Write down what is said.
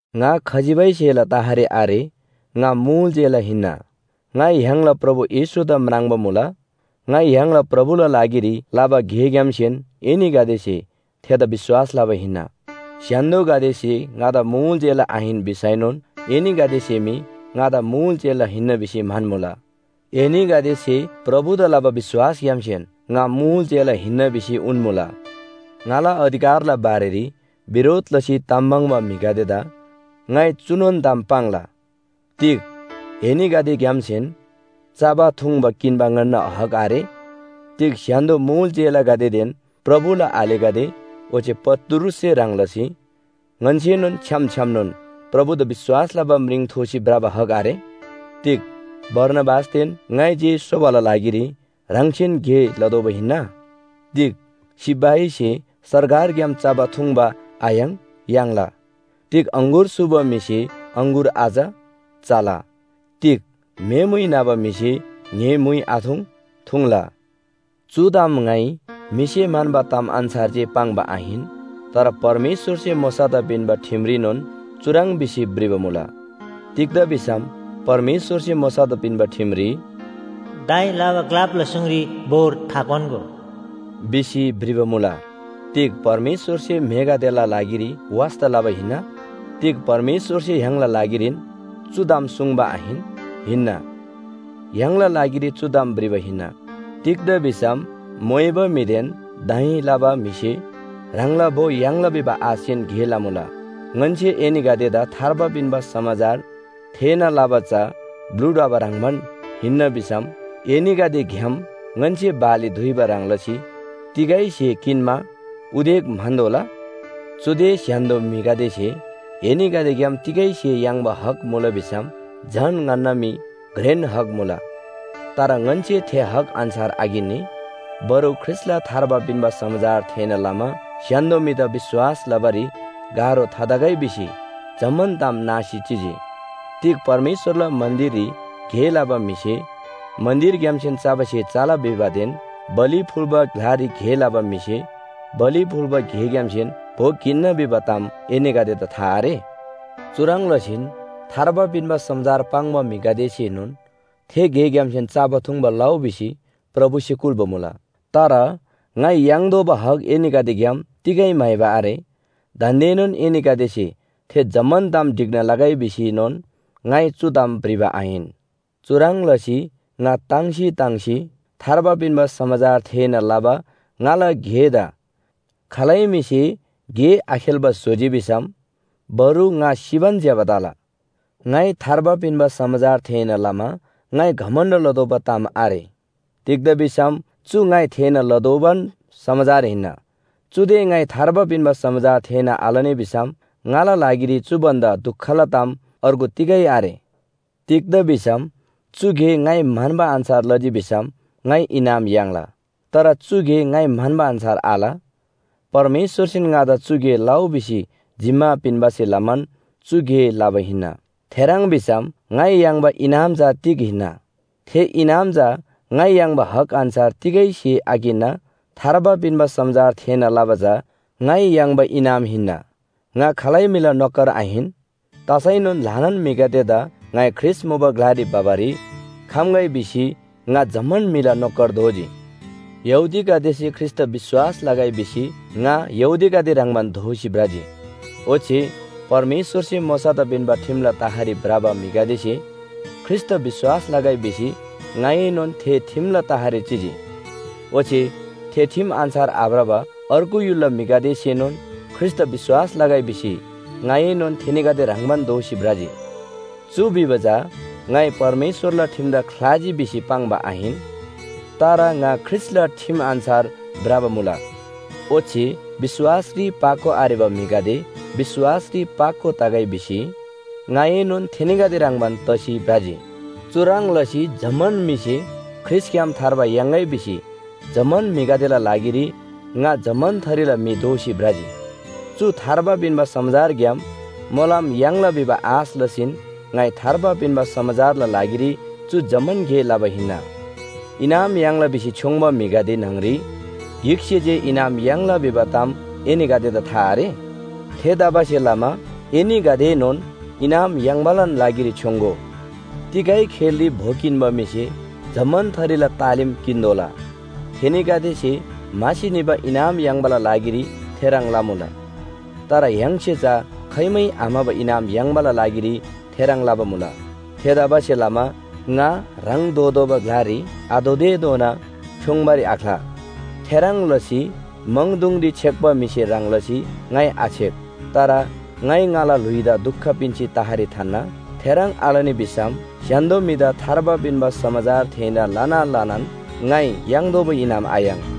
ङा खजिबै स्‍हेला तहरी आरे। ङा मुल चेला हिन्‍ना। ङाइ य्‍हाङला प्रभु येशूदा म्राङ्बा मुला। ङाइ य्‍हाङला प्रभुला लागिरी लबा गेग्‍यामसेन एनीगदेसे थेदा विश्‍वास लबा हिन्‍ना। स्‍य्‍हान्‍दोगदेसे ङादा मुल चेला आहिन भिसैनोन एनीगदेसे मी ङादा मुल चेला हिन्‍ना भिसी म्‍हन्‍मुला। एनीगदेसे प्रभुदा लबा विश्‍वासग्‍यामसेन ङा मुल चेला हिन्‍ना भिसी उन्‍मुला। ङाला अधिकारला बारेरी बिरोध लसी ताम पाङ्बा म्‍हिगदेदा ङाइ चुनोन ताम पाङ्ला, तिग एनीगदेग्‍यामसेन चबा थुङ्बा किन्‍बा ङन्‍ना हक आरे? तिग स्‍य्‍हान्‍दो मुल चेलागदेदेन प्रभुला आलेगदे ओच्‍छे पत्रुससे ह्रङ् लसी ङन्‍सेनोन छ्‌याम छ्‌यामनोन प्रभुदा विश्‍वास लबा म्रिङ थोसी भ्रबा हक आरे? तिग बारनाबासदेन ङाइ जे सोबाला लागिरी ह्राङसेन गे लतोःबा हिन्‍ना? तिग सिपाहीसे सरकारग्‍याम चबा थुङ्बा आयाङ्? याङ्ला। तिग अङगुर सूबा म्‍हिसे अङगुर आच? चला। तिग म्‍हे मुइ न्‍हबा म्‍हिसे ङ्‍हे म्‍हुइ आथुङ्? थुङ्ला। चु ताम ङाइ म्‍हिसे म्‍हन्‍बा ताम अन्‍छार जे पाङ्बा आहिन। तर परमेश्‍वरसे मोशादा पिन्‍बा ठिमरीनोन चुह्रङ् भिसी भ्रिबा मुला। तिग्‍दा भिसम परमेश्‍वरसे मोशादा पिन्‍बा ठिमरी “दाइँ लबा ग्‍लापला सुङरी बोर थाक्‍वान्‍गो” भिसी भ्रिबा मुला। तिग परमेश्‍वरसे म्‍हेगदेला लागिरी वास्‍ता लबा हिन्‍ना? तिग परमेश्‍वरसे य्‍हाङला लागिरीन चु ताम सुङ्बा आहिन? हिन्‍ना। य्‍हाङला लागिरी चु ताम भ्रिबा हिन्‍ना। तिग्‍दा भिसम मोइबा म्‍हिदेन दाइँ लबा म्‍हिसे ह्राङला भो याङ्ला भिबा आशसेन गे लमुला। ङन्‍से एनीगदेदा थार्बा पिन्‍बा समाचार थेःना लबा चा ब्‍लु ढ्वबा ह्रङ्‌बान हिन्‍ना भिसम एनीगदेग्‍याम ङन्‍से बाली दुइबा ह्रङ् लसी तिगै स्‍हे किन्‍मा उदेक म्‍हन्‍तोःला? चुदे स्‍य्‍हान्‍दो म्‍हिगदेसे एनीगदेग्‍याम तिगै स्‍हे याङ्बा हक मुला भिसम झन ङन्‍ना मी घ्रेन हक मुला। तर ङन्‍से थे हक अन्‍छार आकिन्‍नी। बरु ख्रीष्‍टला थार्बा पिन्‍बा समाचार थेःना लमा स्‍य्‍हान्‍दो म्‍हिदा विश्‍वास लबारी गाह्रो थातगै भिसी जम्‍मान ताम नासी चिजी। तिग परमेश्‍वरला मन्‍दिररी गे लबा म्‍हिसे मन्‍दिरग्‍यामसेन चबा स्‍हे चला भिबादेन बलि फुल्‍बा ग्‍लारी गे लबा म्‍हिसे बलि फुल्‍बा स्‍हेग्‍यामसेन भो किन्‍ना भिबा ताम एनीगदेदा था आरे? चुह्रङ् लसीन थार्बा पिन्‍बा समाचार पाङ्बा म्‍हिगदेसेनोन थे गेग्‍यामसेन चबा थुङ्बा लउ भिसी प्रभुसे कुल्‍बा मुला। तर ङाइ याङ्तोःबा हक एनीगदेग्‍याम तिगै म्‍हाइबा आरे। दान्‍देनोन एनीगदेसे थे जम्‍मान ताम ढिक्‍ना लगै भिसीएनोन ङाइ चु ताम भ्रिबा आहिन। चुह्रङ् लसी ङा ताङ्सी ताङ्सी थार्बा पिन्‍बा समाचार थेःना लबा ङाला गेदा खालै म्‍हिसे गे आखेल्‍बा स्‍होजी भिसम बरु ङा सिबान ज्‍यबा तला। ङाइ थार्बा पिन्‍बा समाचार थेःना लमा ङाइ घमण्‍ड लतोःबा ताम आरे। तिग्‍दा भिसम चु ङाइ थेःना लतोःबान समाचार हिन्‍ना। चुदे ङाइ थार्बा पिन्‍बा समाचार थेःना आलनी भिसम ङाला लागिरी चु भन्‍दा दुखला ताम अर्गु तिगै आरे। तिग्‍दा भिसम चु गे ङाइ म्‍हन्‍बा अन्‍छार लजी भिसम ङाइ इनाम याङ्ला। तर चु गे ङाइ म्‍हन्‍बा अन्‍छार आल। परमेश्‍वरसेन ङादा चु गे लउ भिसी जिम्‍मा पिन्‍बासे लमान चु गे लबा हिन्‍ना। थेह्रङ् भिसम ङाइ याङ्बा इनाम चा तिग हिन्‍ना? थे इनाम चा ङाइ याङ्बा हक अन्‍छार तिगै स्‍हे आकिन्‍ना थार्बा पिन्‍बा समाचार थेःना लबा चा ङाइ याङ्बा इनाम हिन्‍ना। ङा खालै म्‍हिला नोकर आहिन। तसैनोन ल्‍हानान म्‍हिगदेदा ङाइ ख्रीष्‍ट मुबा ग्‍लारी भबारी खम्‍गै भिसी ङा जम्‍मान म्‍हिला नोकर दोजी। यहूदीगदेसे ख्रीष्‍टदा विश्‍वास लगै भिसी ङा यहूदीगदे ह्रङ्‌बान दोसी भ्रजी। ओच्‍छे परमेश्‍वरसे मोशादा पिन्‍बा ठिमला तहरी भ्रबा म्‍हिगदेसे ख्रीष्‍टदा विश्‍वास लगै भिसी ङाएनोन थे ठिमला तहरी चिजी। ओच्‍छे थे ठिम अन्‍छार आभ्रबा अर्गु य्‍हुलला म्‍हिगदेसेनोन ख्रीष्‍टदा विश्‍वास लगै भिसी ङाएनोन थेनीगदे ह्रङ्‌बान दोसी भ्रजी। चु भिबा चा ङाइ परमेश्‍वरला ठिमदा ख्‍लाजी भिसी पाङ्बा आहिन, तर ङा ख्रीष्‍टला ठिम अन्‍छार भ्रबा मुला। ओच्‍छे विश्‍वासरी पाको आरेबा म्‍हिगदे विश्‍वासरी पाको तगै भिसी ङाएनोन थेनीगदे ह्रङ्‌बान तसी भ्रजी। चुह्रङ् लसी जम्‍मान म्‍हिसे ख्रीष्‍टग्‍याम थार्बा याङ्‌गै भिसी जम्‍मान म्‍हिगदेला लागिरी ङा जम्‍मान थरीला म्‍हि दोसी भ्रजी। चु थार्बा पिन्‍बा समाचारग्‍याम मोलम याङ्ला भिबा आश लसीन ङाइ थार्बा पिन्‍बा समाचारला लागिरी चु जम्‍मान गे लबा हिन्‍ना। इनाम याङ्ला भिसी छ्‍योङ्‍बा म्‍हिगदे न्‍हङरी गिकसे जे इनाम याङ्ला भिबा ताम एनीगदेदा था आरे? थेतबासेलमा एनीगदेएनोन इनाम याङ्‍बालान लागिरी छ्‌योङ्‍गो। तिगै खेलरी भो किन्‍बा म्‍हिसे जम्‍मान थरीला तालिम किन्‍तोःला। थेनीगदेसे म्‍हासी निबा इनाम याङ्बाला लागिरी थेह्रङ् लमुला। तर य्‍हाङसे चा खाइमै आम्‍हबा इनाम याङ्बाला लागिरी थेह्रङ् लबा मुला। थेतबासेलमा ङा ह्राङ धोतोःबा ग्‍लारी आधोतेधोना छ्‌योङ्‌बारी आख्‍ला। थेह्रङ् लसी म्‍हाङदुङरी छेक्‍बा म्‍हिसे ह्रङ् लसी ङाइ आछेक। तर ङाइ ङाला ल्‍हुइदा दुख पिन्‍सी तहरी थान्‍ना। थेह्रङ् आलनी भिसम स्‍य्‍हान्‍दो म्‍हिदा थार्बा पिन्‍बा समाचार थेःना लना लनान ङाइ याङ्तोःबा इनाम आयाङ्।